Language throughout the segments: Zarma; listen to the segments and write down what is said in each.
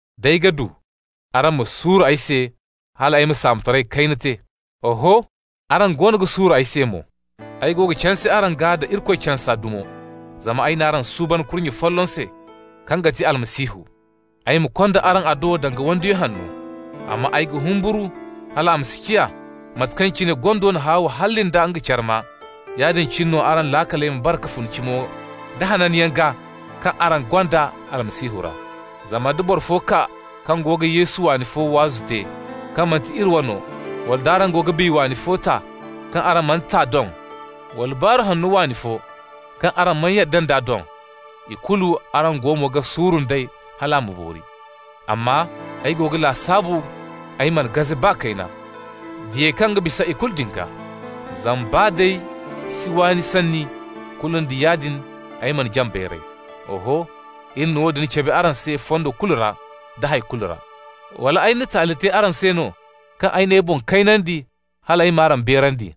D'ay ga du, araŋ ma suuru ay se hal ay ma saamotaray kayna te! Oho, araŋ goono ga suuru ay se mo. Ay go ga canse araŋ gaa da Irikoy cansa dumo. Zama ay n'araŋ suuban kurnye folloŋ se kaŋ ga ti Almasihu, ay ma konda araŋ a do danga wandiyo hanno. Amma ay ga humburu hal a ma si ciya, mate kaŋ cine gondo na Hawa halli nda nga carma, yaadin cine no araŋ laakaley ma bare ka fun cimo da hananyaŋ gaa kaŋ araŋ gonda Almasihu ra. Zama nda boro fo kaa kaŋ go ga Yesu waani fo waazu te, kaŋ manti iri wano, wala nd'araŋ go ga biya waani fo ta, kaŋ araŋ man'a ta doŋ, wala Baaru Hanno waani fo, kaŋ araŋ mana yadda nd'a doŋ, ikulu araŋ go mo ga suuru nd'ey hal a ma boori! Amma ay go ga lasaabu ay mana gaze baa kayna «diyey kaŋ ga bisa ikulu» din gaa. Zama baa d'ay si waani sanni, kulu nda yaadin ay mana jaŋ bayray. Oho, iri na woodin cabe araŋ se fondo kulu ra nda hay kulu ra. Wala ay na taali te araŋ se no kaŋ ay n'ay boŋ kaynandi hal ay m'araŋ beerandi,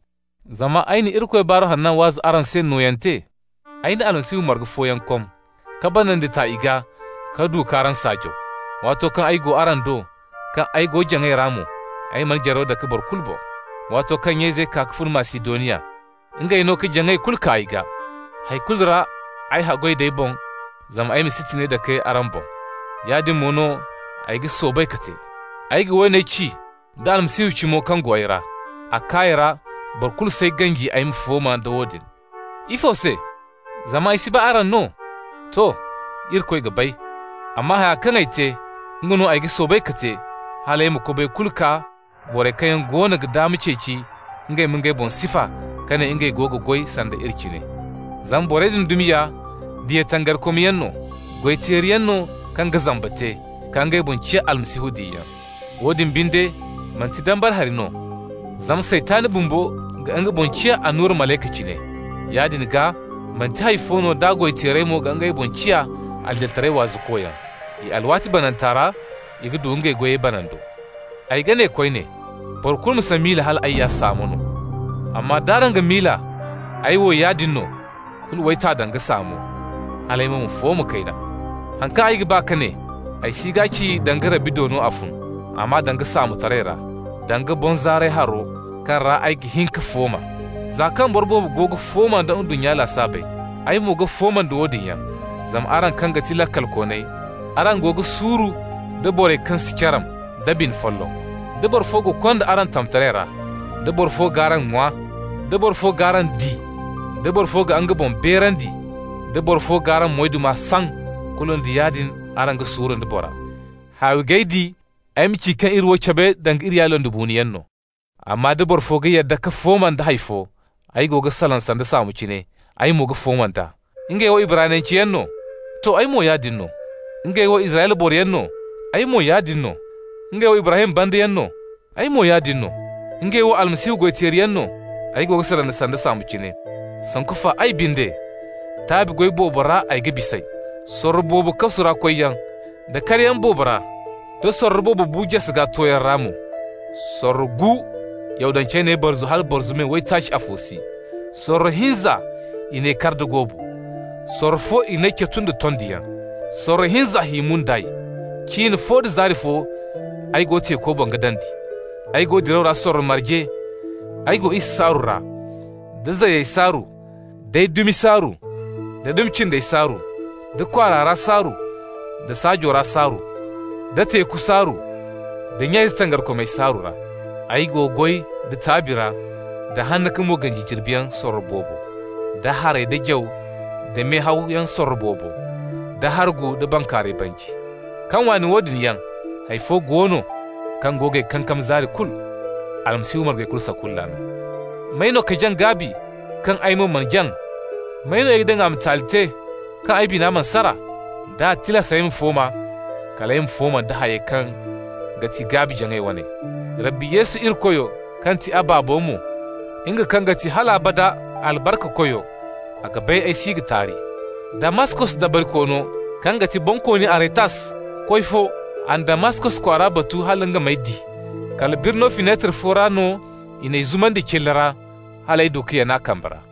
zama ay na Irikoy Baaru Hanna waazu araŋ se nooyante? Ay na Almasihu marga fooyaŋ kom, ka banandi ta i gaa ka du k'araŋ saajaw. Waato kaŋ ay go araŋ do, kaŋ ay go jaŋay ra mo, ay mana jaraw dake boro kulu boŋ. Waato kaŋ nya-izey kaa ka fun Masidoniya, ngey no ka jaŋay kulu kaa ay gaa. Hay kulu ra ay haggoy d'ay boŋ zama ay ma si tiŋay dake araŋ boŋ. Yaadin mo no ay ga soobay ka te. Ay ga woone ci da Almasihu cimo kaŋ go ay ra: Akaya ra boro kulu s'ay ganji ay ma fooma nda woodin. Ifo se? Zama ay si ba araŋ no? To, Irikoy ga bay! Amma haya kaŋ ay te, nga no ay ga soobay ka te, hal ay ma kobay kulu kaa borey kaŋ yaŋ goono ga daama ceeci ngey ma ngey boŋ sifa ka ne ngey go ga goy sanda iri cine. Zama borey din dumi ya diya tangarikomyaŋ no, goy-teeriyaŋ no kaŋ ga zamba te, ka ngey boŋ ciya Almasihu diyayaŋ. Woodin binde, manti dambara hari no, zama Saytan bumbo ga nga boŋ ciya annura malayka cine. Yaadin gaa manti hay fo no d'a goy-teerey mo ga ngey boŋ ciya adilitaray waazukoyaŋ. I alwaati bananta ra i ga du ngey goyey banando. Ay ga ne koyne: boro kulu ma si miila hal ay ya saamo no, amma d'araŋ ga miila ay wo yaadin no, kulu w'ay ta danga saamo, hal ay mo ma fooma kayna. Haŋ kaŋ ay ga ba ka ne, ay si g'a ci danga Rabbi do no a fun, amma danga saamotaray ra, danga boŋzaaray haro kaŋ ra ay ga hin ka fooma. Za kaŋ boro boobo go ga fooma nda ndunnya lasaabey, ay mo ga fooma nda woodin yaŋ. Zama araŋ kaŋ ga ti laakalkooney, araŋ go ga suuru nda borey kaŋ si caram da bine folloŋ. Da boro fo ga konda araŋ tamtaray ra, da boro fo g'araŋ ŋwa, da boro fo g'araŋ di, da boro fo ga nga boŋ beerandi, da boro fo g'araŋ moyduma saŋ -- kulu nda yaadin araŋ ga suuru nda bora! Haawi g'ay di ay ma ci kaŋ iri wo cabe danga iri ya londibuunoyaŋ no. Amma da boro fo ga yadda ka fooma nda hay fo (ay go ga salaŋ sanda saamo cine) ay mo ga fooma nd'a. Ngey wo Ibraniyanceyaŋ no? To, ay mo yaadin no. Ngey wo Israyla boroyaŋ no? Ay mo yaadin no. Ngey wo Ibrahim bandayaŋ no? Ay mo yaadin no. Ngey wo Almasihu goy-teeriyaŋ no? (ay go ga salaŋ sanda saamo cine), sanku fa binde ay! Taabi goy boobo ra ay ga bis'ey, da sorro boobo kasu ra koyyaŋ, da karyaŋ boobo ra, da sorro boobo bu-jase gaa tooyaŋ ra mo. Sorro gu Yahudancey n'ay barzu hala barzu me waytaaci afo si. Sorro hinza i n'ay kar da goobu. Sorro fo i n'ay catu nda tondiyaŋ. Sorro hinza hi mun d'ay. Cin fo da zaari fo ay go teeku boŋ ga dandi. Ay go diraw ra sorro marge, ay go isa saaru ra, da zayey saaru, d'ay dumi saaru, da dumi cindey saaru, da kwaara ra saaru, da saajo ra saaru, da teeku saaru, da nya-ize tangarikomey saaru ra. Ay go goy da taabi ra, da hanna ka mo ganji jirbi yaŋ sorro boobo, da haray, da jaw, da mehawyaŋ sorro boobo, da hargu nda bankaaray banji. Kaŋ waana woodin yaŋ, hay fo go no kaŋ go g'ay kankam zaari kulu: Almasihu margey kulu sakulla no. May no ka jaŋ gaabi kaŋ ay mo mana jaŋ? May no i ga daŋ a ma taali te, kaŋ ay bina mana sara? D'a tilas ay ma fooma, kal ay ma fooma nda hayey kaŋ ga ti ay gaabi-jaŋa waney. Rabbi Yesu Irikoyo, kaŋ ga ti a Baabo mo, nga kaŋ ga ti hal abada albarkakoyo, a ga bay ay si ga taari! Damaskos dabarikoono kaŋ ga ti Bonkooni Aretas koy fo, a na Damaskos kwaara batu hal nga m'ay di. Kala birno finetar fo ra no i n'ay zumandi cilla ra, hal ay du ka yana a kambe ra.